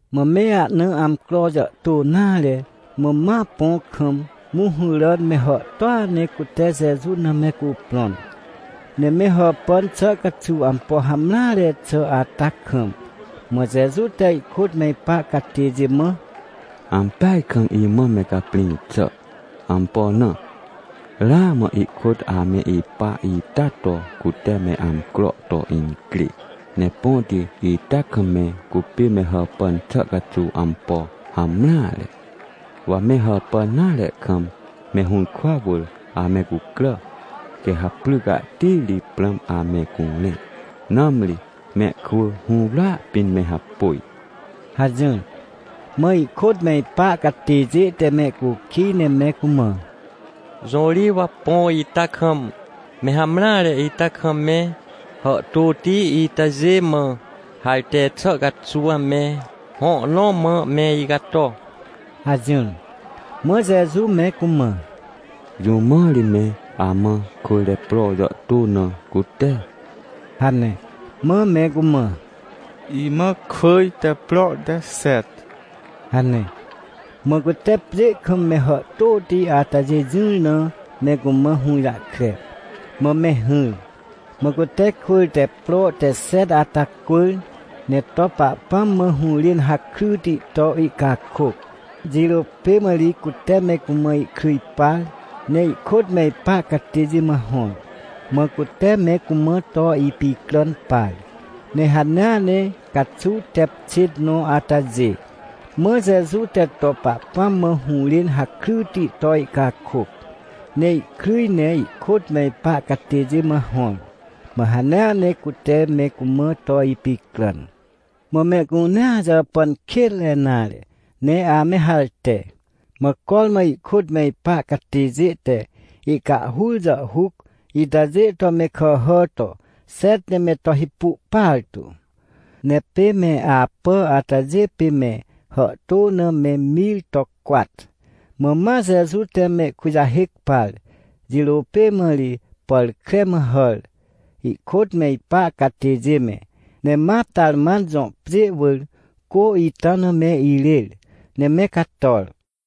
Mã me ahna amcro jàhtô nare, mã ma põ kam, mũhũràn me hàhtôa ne cute Jeju na me cuprõn. Ne me hàpàn xà caxuw ampo hamreare xà ata kam, mã Jeju te ihkôt me ipa catêjê mã: — Ampeaj kam imã me caprĩ xà. Ampo na? Ramã ikôt ame ipa ita to cute me amcro to incrê, ne põti ita kam me cupê me hàpàn xà caxuw ampo hamreare. Wa me hàpàn nare kam me hũrkwa wỳr ame cucrà, quê ha pry cahti ri prãm ame curẽ, nãmri mehkwỳ hũwrya pĩn me hapôj — hajỹr. Mã ihkôt me ipa catêjê te mehcukij ne me cumã: — Jõ ri wa põ ita kam, me hamreare ita kam me hàhtôti itajê mã harte xà caxuw me hõ nõ mã me icato? — hajỹr. Mã Jeju me cumã: — Jũ mã ri me amã kwỳr te pro jàhtô na cute? — hane. Mã me cumã: — Imã kwỳr te pro te xet — hane. Mã cute pjê kam me hàhtôti atajê jỹr na me cumã hũjahkre, mã me hỹr. Mã cute kwỳr te pro te xet ata cwỳr, ne to Pahpãm mã hũrên hakryti to ihcakôc. Jirô pê mã ri cute me cumã ihkryj par, ne ihkôt me ipa catêjê mã hõr, mã cute me cumã to ipicràn par. Ne hanea ne caxuw tep xêt nõ atajê, mã Jeju te to Pahpãm mã hũrên hakryti to ihcakôc, ne ihkryj ne ihkôt me ipa catêjê mã hõr. Mã hanea ne cute me cumã to ipicràn. Mã mehcunea jàpàn kênre nare, ne ame harte. Mã cormã ihkôt me ipa catêjê te ihcahhur jàhhuc itajê to me kàhà to xet ne me to hipu partu. Ne pê me apà atajê pê me hàhtô na me mir to cwat. Mã ma Jeju te mehkujahêc par, jirô pê mã ri pàr kre mã hàr, ihkôt me ipa catêjê me, ne ma Tarman jõ pjê wỳr cô ita na me irêr, ne me cator.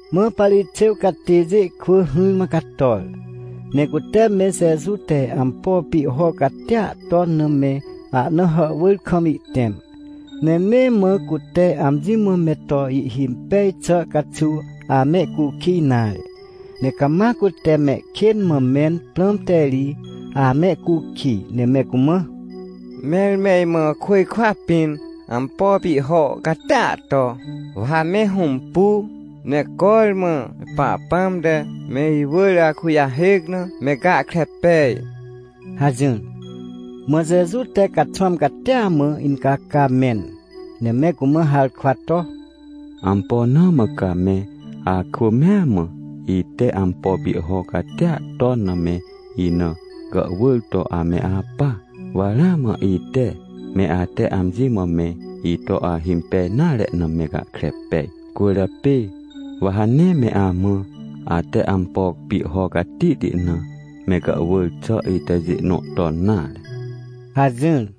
Mã Parixêw catêjê kwỳ hỹrmã cator, ne cute me Jeju te ampo pihho catia ton na me ahna hàhwỳr kam ihtẽm. Ne nee mã cute amji mã me to ihhimpej xà caxuw amehcukij nare. Ne cama cute mehkên mã mẽn prãmte ri amehcukij, ne me cumã: — Mẽr me imã côjkwa pĩn ampo pihho catia to, wa ha me hõmpu, ne cormã me Pahpãm te me iwỳr akujahêc na me gahkre pej — hajỹr. Mã Jeju te caxwãm catia mã incaca mẽn, ne me cumã harkwa to: — Ampo na mã ca me akwỳ mea mã, ite ampo pihho catia ton na me ina gàhwỳr to ame apa? Wa ramã ite, me ate amji mã me ito ahimpej nare na me gahkre pej. Cwỳrjapê wa ha nee me amã, ate ampo pihho catihti na me gàhwỳr xà itajê nõ ton nare — hajỹr.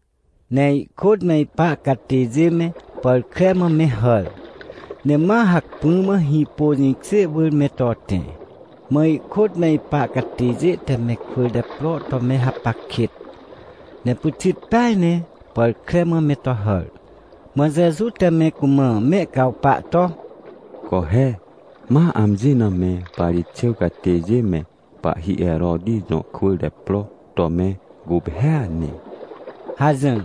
Ne ihkôt me ipa catêjê me pàr kre mã me hàr, ne ma hacpỹ mã hĩpô jĩkjê wỳr me to tẽ. Mã ihkôt me ipa catêjê te me kwỳr te pro to me hapac kêt, ne pyxit peaj ne pàr kre mã me to hàr. Mã Jeju te me cumã mehcawpa to: — Co he, ma amji na me Parixêw catêjê me, pahhi Heroti jõ kwỳr te pro to me guphêa ne! — hajỹr.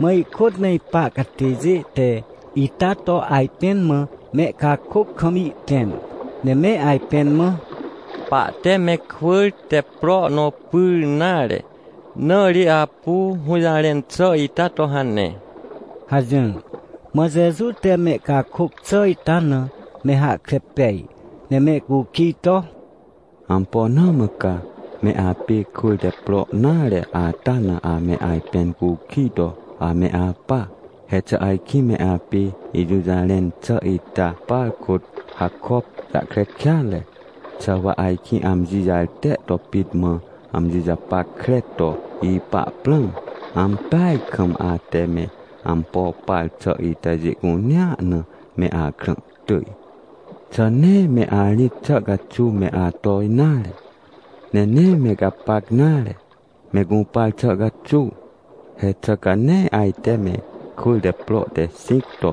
Mã ihkôt me ipa catêjê te ita to ajpẽn mã mehcakôc kam ihtẽm, ne me ajpẽn mã: — Pahte me kwỳr te pro nõ pyr nare, na ri apu hũjarẽn xà ita to hane — hajỹr. Mã Jeju te mehcakôc xà ita na me hahkre pej, ne mehcukij to: — Ampo na mã ca me apê kwỳr te pro nare ata na ame ajpẽn cukij to ame apa? He xà ajkĩ me apê ijũjarẽn xà ita par kôt hakop jahkre kêatre? Xà wa ajkĩ amji jarte to pit mã amji japackre to ipa prãm? Ampeaj kam ate me ampo par xà itajê cunea na me akrã tỳj. Xà nee me arĩt xà caxuw me ato nare? Ne nee me gapac nare, me gũpar xà caxuw? He xà ca nee ajte me kwỳr te pro te xĩc to,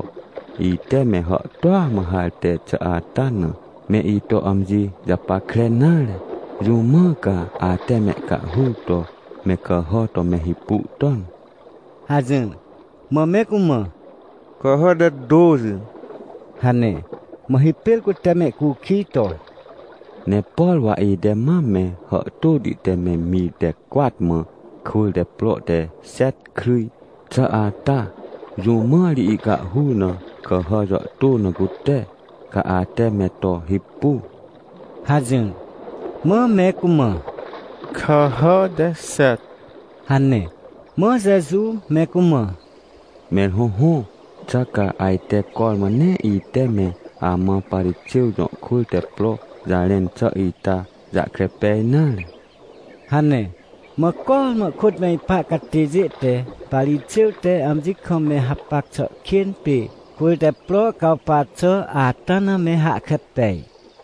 ite me hàhtôa mã harte xà ata na, me ito amji japackre nare? Jũ mã ca ate mehcahhur to me kàhà to me hipu ton? — hajỹr. Mã me cumã: — Kàhà te tôxi — hane. Mã hipêr cute mehcukij to: — Ne por wa ite mam me hàhtôti te me mir te cwat mã kwỳr te pro te xet kryj xà ata, jũ mã ri ihcahhur na kàhà jàhtô na cute, ca ate me to hipu? — hajỹr. Mã me cumã: — Kàhà te xet — hane. Mã Jeju me cumã: — Mẽr hõhõ, xà ca ajte cormã nee ite me amã Parixêw jõ kwỳr te pro jarẽn xà ita jahkre pej nare? — hane. Mã cormã ihkôt me ipa catêjê te Parixêw te amji kam me hapac xà kên pê kwỳr te pro cawpa xà ata na me hahkre pej.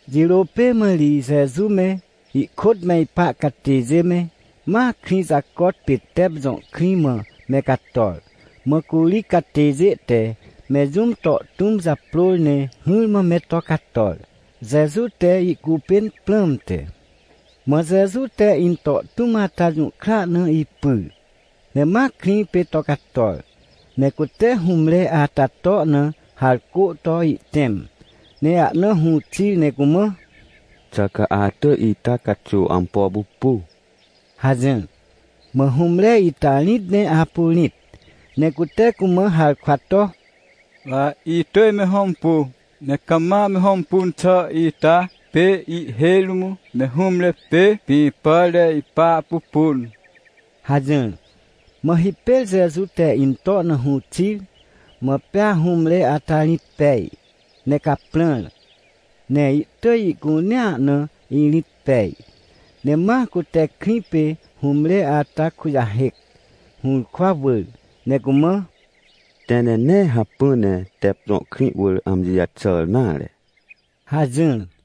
Jirô pê mã ri Jeju me, ihkôt me ipa catêjê me, ma krĩ jacot pê Tep jõ krĩ mã me cator. Mã curi catêjê te me jũm to tũm japrôr ne hỹrmã me to cator, Jeju te ihcupên prãmte. Mã Jeju te into tũm ata jũhkra na ipyr, ne ma krĩ pê to cator. Ne cute hũmre ata to na harcô to ihtẽm, ne ahna hũ xir ne cumã: — Xà ca atỳj ita caxuw ampo pupu? — hajỹr. Mã hũmre ita rĩt ne apu rĩt, ne cute cumã harkwa to: — Wa itỳj me hõmpu, ne cama me hõmpun xà ita pê ihhêj rũm me hũmre pê pĩ pàr te ipa pupun — hajỹr. Mã hipêr Jeju te into na hũ xir. Mã pea hũmre ata rĩt pej, ne caprãr, ne ihtỳj ihcunea na irĩt pej. Ne ma cute krĩ pê hũmre ata kujahêc, hũrkwa wỳr, ne cumã: — Tẽ ne nee hacpỹ ne Tep jõ krĩ wỳr amji jaxàr nare — hajỹr.